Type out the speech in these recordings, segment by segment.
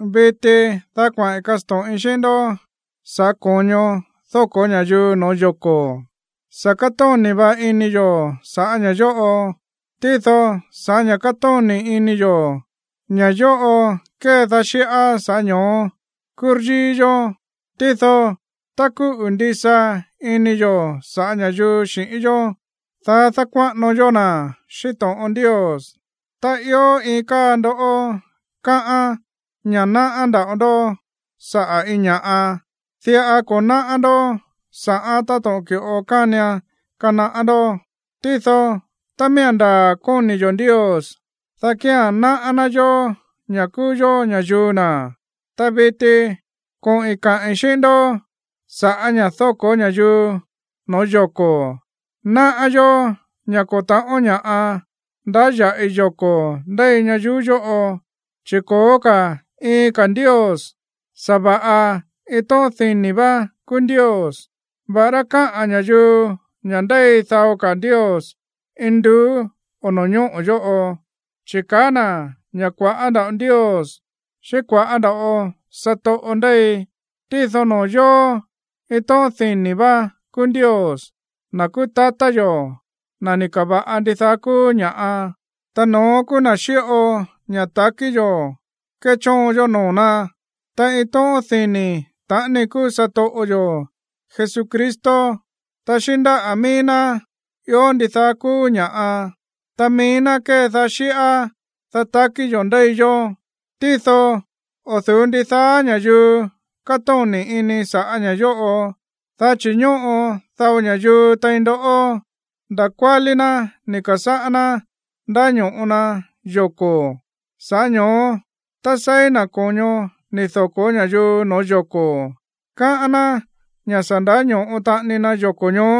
Viti, dá kuaꞌi̱n kasto̱ꞌin xíꞌín ndó sa̱ꞌá ko̱ño dóko̱ ña̱yuu no̱ó yoko̱. Sa̱ kátóni̱ va̱ꞌa ini yo̱ sa̱ꞌá ña̱ yóꞌo. Tído sa̱ꞌá ña̱ kátóni̱ ini yo̱, ña̱ yóꞌo kédaá xíꞌá, sa̱ꞌá ño̱ó kúryíí yó. Tído tá kúꞌu̱ ndisa ini yo̱ sa̱ꞌá ña̱yuu xi̱ꞌín yó, dá dákuáꞌano yó na̱ xíꞌín to̱ꞌon Ndios. Tá ió iin káa ndó káꞌán ña̱ náꞌá nda̱ꞌo ndó saꞌa̱ iin ña̱ꞌa, diꞌa ko̱ náꞌá ndó sa̱ꞌán táto̱ꞌon ki̱ꞌo kánian kanaꞌá ndó. Tído tá miía̱n ndaa̱ kóni̱ yo̱ Ndios, dá kía̱n náꞌá ná yó, ña̱ kúú yó ña̱yuu na̱. Ta viti koꞌi̱n kaꞌi̱n xíꞌín ndó sa̱ꞌá ña̱ dóko̱ ña̱yuu no̱ó yoko̱. Náꞌá yó ña̱ ko̱ ta̱ꞌón ña̱ꞌa ndáya̱ꞌi yoko̱ ndéi ñayuú yóꞌo, chi̱ ko̱ó ka̱ iin ka̱ ndios, sa̱va̱ꞌa iin tóꞌón dini̱ vá kúú Ndios. Va̱ꞌará káꞌa̱n ña̱yuu ña̱ ndéi dao ka̱ ndios induú o no̱ñóꞌo̱ yóꞌo, chi̱ kaá na̱ ña̱ kua̱ꞌá nda̱ꞌo ndios xíꞌín kua̱ꞌá nda̱ꞌo satoꞌo ndéi, tído noo̱ yóó, iin tóꞌón dini̱ vá kúú Ndios, na̱ kúú tatá yo̱, na̱ ni̱ ka̱va̱ꞌa ndidaá kúú ña̱ꞌa, ta no̱ón kúú na̱ xíꞌo ña̱ ta̱kí yo̱ kéchóon yó noo̱ ná. Ta iin tóꞌón dini̱ taꞌani kúú satoꞌo yo̱ Jesucristo. Ta xíꞌín ndáꞌa̱ míí ná ió ndidaá kúú ña̱ꞌa, ta mií ná kédaá xíꞌá, dá takí yo̱ ndéi yó. Tído o̱ du̱ú ndidaá ña̱yuu kátóni̱ ini sa̱ꞌá ña̱ yóꞌo. Dá chi̱ ñóꞌo dao ña̱yuu tein ndó, nda̱ kuálí ná ni̱ ka̱sáꞌá ná ndáño̱ꞌo na yoko̱. Sa̱ꞌá ño̱ó tá seí na̱ ko̱ño ni̱ doko̱ ña̱yuu no̱ó yoko̱, káꞌán ná ña̱ sa̱ ndáño̱ꞌo taꞌani na yoko̱ ñoó,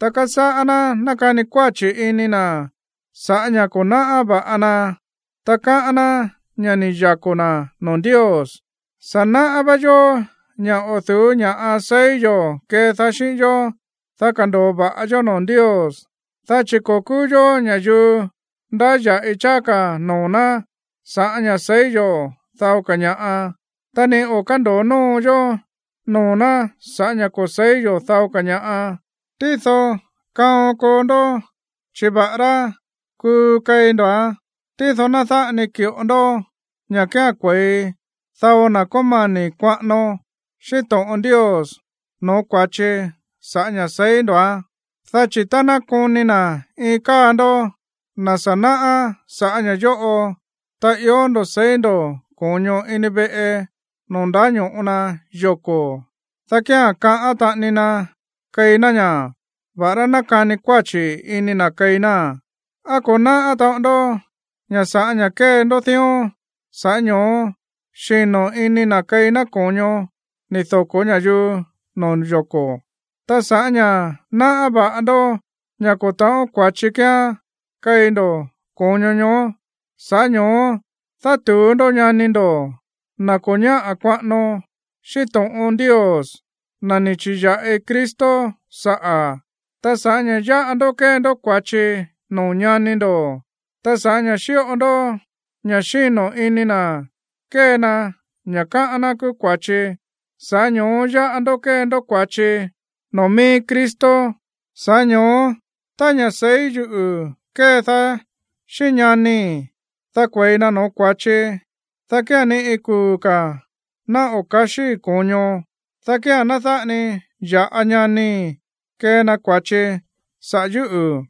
ta kasáꞌá ná nákani kuáchi̱ ini na̱ sa̱ꞌá ña̱ ko̱ náꞌá va̱ꞌa na, ta káꞌán ná ña̱ ni̱ yako̱ na̱ noo̱ Ndios. Sa̱ náꞌá vá yó ña̱ o̱ du̱ú ña̱ꞌa seí yo̱ kedaá xíꞌín yó, dá kando̱o va̱ꞌa yó noo̱ Ndios. Dá chi̱ ko̱ kúú yó ña̱yuu ndáya̱ꞌi cháá ka̱ noo̱ ná sa̱ꞌá ña̱ seí yo̱ dao ña̱ꞌa, ta ni o̱ kándo̱o nóo yó noo̱ ná sa̱ꞌá ña̱ ko̱ se̱í yo̱ dao ka̱ ña̱ꞌa. Tído kaon koo ndó, chi̱ va̱ꞌará kuu keí ndo̱án, tído ná dáꞌa ni ki̱ꞌo ndó ña̱ kía̱n kue̱i dao na̱ kómani̱ kuaꞌano xíꞌín to̱ꞌon Ndios no̱ó kua̱chi sa̱ꞌá ña̱ seí ndo̱án. Dá chi̱ tá ná koni na̱ iin káa ndoꞌó, na̱ sa̱ náꞌá sa̱ꞌá ña̱ yóꞌo, ta ió ndo̱ seí ndo̱ ko̱ño ini veꞌe noo̱ ndáño̱ꞌo ña̱yuu yoko̱, dá kía̱n kaꞌán taꞌani na keí ná ña̱, va̱ꞌará nákani kuáchi̱ ini na̱ keí náa̱n. ¿Á ko̱ náꞌá taꞌon ndó ña̱ sa̱ꞌá ña̱ kée ndó dión, sa̱ꞌá ño̱ó xíno̱ ini na̱ keí ná ko̱ño ni̱ doko̱ ña̱yuu no̱ó yoko̱? Ta sa̱ꞌá ña̱ náꞌá va̱ꞌa ndó ña̱ ko̱ ta̱ꞌón kua̱chi kíán keí ndó ko̱ño ñoó, sa̱ꞌá ño̱ó dátu̱ú ndó ñani ndo̱, na̱ ko̱ ñáꞌa̱ kuaꞌano xíꞌín to̱ꞌon Ndios, na̱ ni̱ chi̱ya̱ꞌi Cristo saꞌa̱. Ta sa̱ꞌá ña̱ yáꞌa ndó kée ndó kua̱chi noo̱ ñani ndo̱, ta sa̱ꞌá ña̱ xíꞌo ndó ña̱ xíno̱ ini na̱ kée na ña̱ káꞌán ná kúú kua̱chi, sa̱ꞌá ño̱ó yáꞌa ndó kée ndó kua̱chi noo̱ mií Cristo. Sa̱ꞌá ño̱ó tá ña̱ꞌa seí yuꞌu̱ kédaá xíꞌín ñanii̱, dá kue̱i na no̱ó kua̱chi, dá kía̱n ni iin kuu̱ ka̱ ná o̱ ka̱xíí ko̱ño, dá kía̱n ná dáꞌa ni ya̱ꞌa ñanii̱ kee na kua̱chi saꞌa̱ yúꞌu̱.